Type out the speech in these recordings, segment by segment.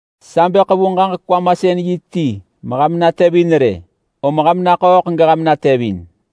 Sa bë ḳevu ġaġek-kwamasën-yi ti meham natevin rë! Om ham naḳööḳ geham natevin!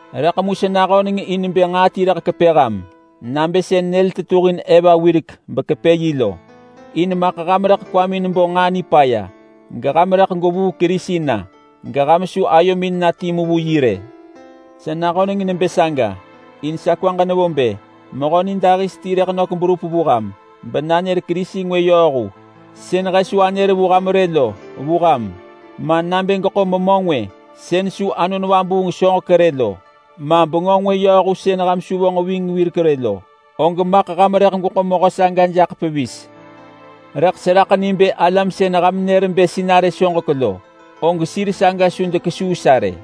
Rëḳ mu sa nahöneng in bë nġaa ti rëḳ kepë ham nabë sën nyël tetuhin Eva wirek bekepë yi lo. In maḳ ham rëḳ kwamin bo nġaa nipaya geham rëḳ gwevuu Kerisi na geham su ayomin na timu vu yi rë. Sa nahöneng nebë saga in sa kwaġ nevo bë mehö nidahis ti bë nök berup vu ham benanër kerisi ngwë yööhu sën he su anër vu ham rë lo vu ham, ma nabë geḳo memö ngwë sën su Anon Vabuung soġek rë lo, ma bengö ngwë yööhu sën ham su vonġ ving wirek rë lo, og maḳ ham rëḳ gweḳo mehö saga jaḳ pevis. Rëḳ seraḳ ni bë alam sën ham nër bë sinarë soġek lo, og sir saga su dekesuu sa rë.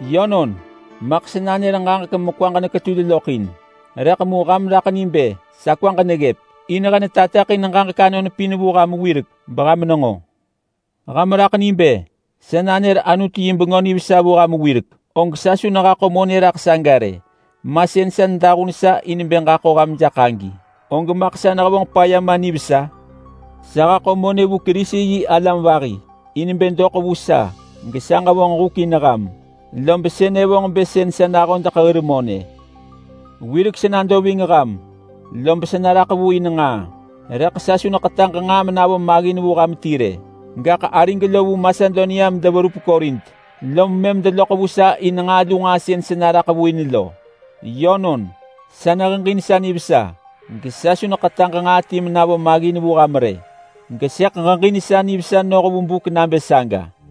Yönon, maḳ sa nanër ġaġek mekwaġ neketul loḳ in. Rëḳ mu ham raḳ ni bë sa kwaġ neggëp, in he netateḳin ġaġek anon pin vu ham wirek beham nenġo. Ham raḳ ni bë sa nanër Anutu yi Bengö Nivesa vu ham wirek, og sa su nehaḳo monë raḳ saga rë. Ma sën sa nedahun sa in bë ġaḳo ham jaḳ agi, og maḳ sa nehevonġ paya ma nivesa? Sa haḳo monë vu Kerisi-yi-alam vahi in bë doḳ vu sa gesa ġevonġ huk in ham, lob sënë vonġ bë sën sa nahodeḳ hir monë. Wirek sa nado ving ham lob sa naraḳ vu in nġaa, rëḳ sa su neḳetaġ nġaa menavo maggin vu ham ti rë. Gaḳ arig lo vu Masedonia medeverup Korint lom mëm deloḳ vu sa in nġaa lu nġaa sën sa naraḳ vu in lo. Yönon, sa neheġin sa nivesa gesa su neḳetaġ in nġaa ti menavo maggin vu ham rë. Gesëḳ ġeġin sa nivesa noh vu buk nabë saga.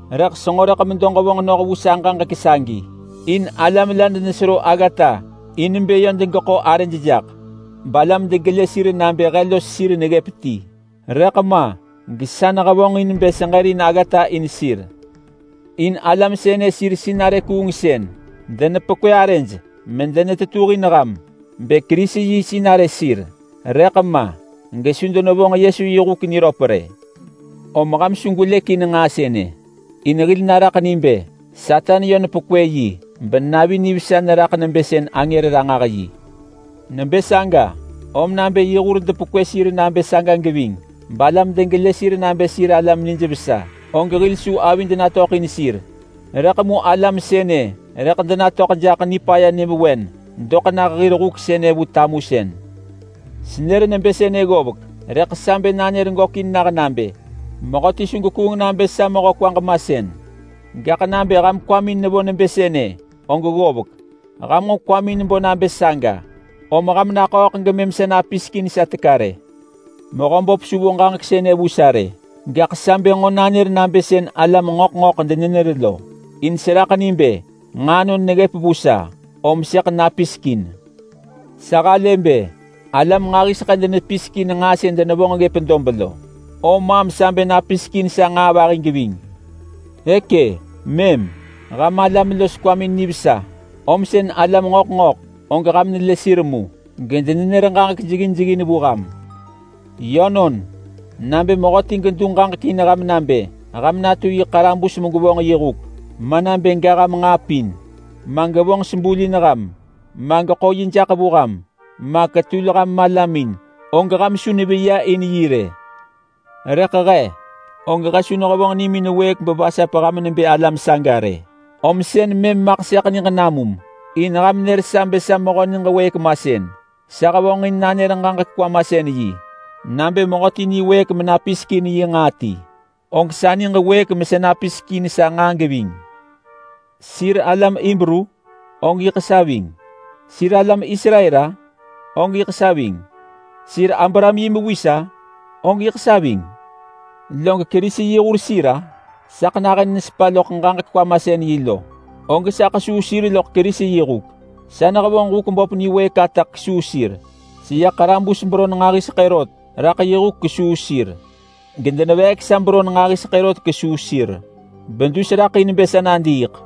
Rëḳ senġo rëḳ medo ġevonġ noh vu sa ġaġek sagi, in alam la denesero aggata in bë yö degeḳo arëj jaḳ balam degelë sir nabë he los sir neggëp ti. Rëḳ ma gesa nehevonġ in bë seġërin aggata in sir. In alam sënë sir sinarë kuungsën. Denepekwë arëj medenetetuhin ham bë Kerisi yi sinarë sir, rëḳ ma gesu denevonġ yi huk niröp rë. Om ham su gwelëk in nġaa sënë, in hil naraḳ ni bë Satan yö nepekwë yi benavi nivesa neraḳ neyoh vu angër ranġah-yi. Nebë saga, om nabë yi hur depekwë sir nabë saga geving balam degelë sir nabë sir alam nijvesa, og hil su avid natöḳ in sir. Rëḳ mu alam sënë rëḳ denatöḳ jaḳ nipaya nyëvewen doḳ nah hir huk sënë vu tamusën. Senër nebë sënë ggovek, rëḳ sa bë nanër gökin nah nabë: Mehöti su gekuung nabë sa mehö kwaġ masën. Gaḳ nabë ham kwamin nevo nebë sënë, og ggovek. Ham nġo kwamin bo nabë saga, om ham naḳööḳ gemëm sa napisek in sa teka rë. Mehöböp su vo ġaġek sënë vu sa rë, gaḳ sa bë nġo nanër nabë sën alam ngöḳ ngöḳ denenër lo, in seraḳ ni bë nġaa anon neggëp vu sa, om sëḳ napisek in. Sa halë bë alam nġahiseḳë denepisek in nġaa sën denevonġ ggëp dob lo, om maam sa bë napisek in sa nġaa vahi geving. E kë mëm, ham alam los kwamin nivesa, om sën alam ngöḳ ngöḳ og ham nelë sir mu gedenenër ġaġek jeggin jeggin vu ham! Yönon! Nabë mehöti gedu ġaġek in ham nabë ham natu yi ḳarabus megwevonġ yi huk, ma nabë ga ham nġaa pin, ma gevonġ sebul in ham, ma geḳo yi jaḳ vu ham, ma ketul ham malamin, og ham su neveya in yi rë. Rëḳ he, og he su nehevonġ nimin wëëk bevasap ham nebë alam saga rë, om sën mëm maḳ sëḳ niġ namum, in ham nër sa bë sa mehö niġ wëëk masën. Rëḳ mu nabë mehöti niwëëk menapisek in yi nġaa ti-om sa hevonġin nanër ġaġek-kwamasën-yi-og sa niġ wëëk mesa napisek in sa nġaa geving. Sir alam Hibru? Og yiḳ sa ving! Sir alam Israel-a? Og yiḳ sa ving! Sir Abraham yi mewis-a? Og yiḳ sa ving! Log Kerisi yi hur sir-a?—Sa nahën nesepa loḳ ġaġek-kwamasën-yi lo!—Og sa ḳesuu sir loḳ Kerisi yi huk. Sa nehevonġ huk böp niwëëk ata kesuu sir. Seya ḳarabus beron nġahiseḳë rot raḳ yi huk kesuu sir, gedeneveek sa beron nġahiseḳë rot kesuu sir bedus neraḳ in bë sa nadiiḳ.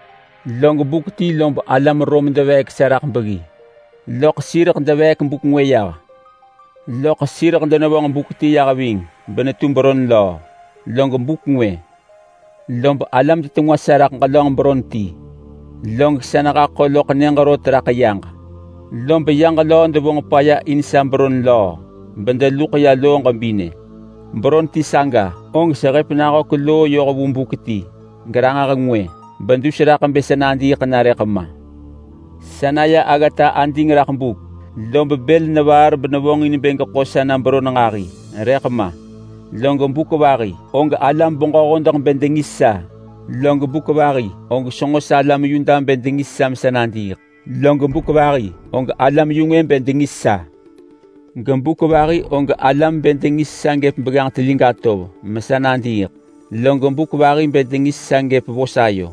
Log buk ti lob alam Rom deveek sa raḳ beggi, loḳ sireḳ deveek buk ngwë yah, loḳ sireḳ denevonġ buk ti yah ving benetu beron löö. Log buk ngwë lob alam detengwa sa raḳ ġelönġ beron ti. Log sa nehaḳo loḳ nyëġ rot raḳ yaġ, lob yaġ löö devonġ paya in sa beron löö bedeluḳ ya loo ġebinë. Beron ti saga og sehëp nahök loo yoh vu buk ti geranġah ngwë bedus raḳ bë sa nadiiḳ na rëḳ ma. Sa naya aggata ading raḳ buk, lob bël nevaar benevonġin bë geḳo sa na beron nġahi, rëḳ ma. Log buk vahi og alam-beġö-hodeḳ bë dengis sa. Log buk vahi og senġo salam Yuda bë dengis sa mesa nadiiḳ, log buk vahi og alam-yu-ngwë bë dengis sa. Gebuk vahi og alam bë dengis sa gëp begganġ telig atov mesa nadiiḳ, log buk vahi bë dengis sa gëp vos ayo.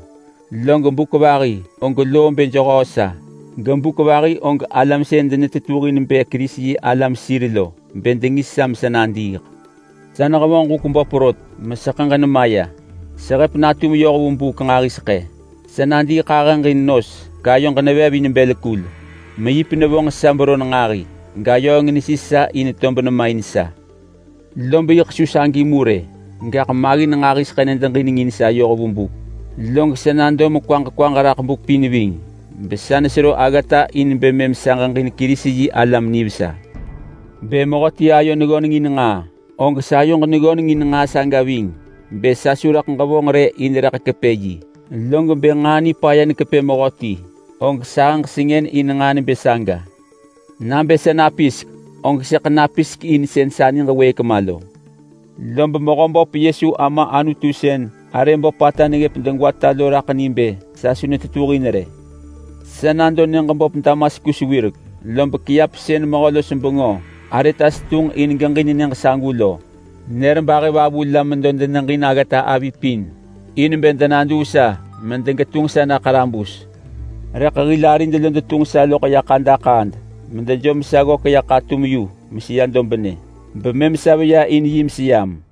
Log buk vahi og loo bë jehöö sa, gebuk vahi og alam sën denetetuhin bë Kerisi-yi-alam sir lo bë dengis sa mesa nadiiḳ. Sa nehevonġ huk böp rot meseḳëġ nemaya. Sehëp natum yoh vu buk nġahiseḳë. Sa nadiiḳahëġ in nos gayoġ nevev in bël kul. Meyip nevonġ sa beron nġahi, gayööng nesis sa in tob nema in sa. Lob yiḳ su sagi mu rë, gaḳ maggin nġahiseḳë nedeġinengin sa yoh vu buk, log sa nado mekwaġ kwaġ raḳ buk pin ving besa nesero aggata in bë mëm sa ġeġin Kerisi-yi-alam nivesa. Bë mehöti ayo neggöneng in nġaa, og sayoġ neggöneng in nġaa saga ving bë sa su rëḳ ġevonġ rë in rëḳ kepë yi. Log bë nġaa nipaya nekepë mehöti, og sahëġ sengën in nġaa nebë saga. Nabë sa napisek, og sëḳ napisek in sën sa niġ wëëk ma lo. Lob Mehöböp Yesu Ama Anutu sën arë böpata neggëp degwata lo raḳ ni bë sa su netetuhin rë. Sa nado nyëġ böp Damaskus wirek, lob kiap sën mehö-los-bengö Aretas tunġ in geġin nyëġ sagu lo, nër bahëvavu la medo deneġin aggata avi pin in bë denaduu sa medegetunġ sa na ḳarabus. Rëḳ hil arid lo detunġ sa loḳ ya ḳadaḳaad medejom sa ggök ya ḳatum yu meseya dobnë, bemëm sa veya in yi meseyam.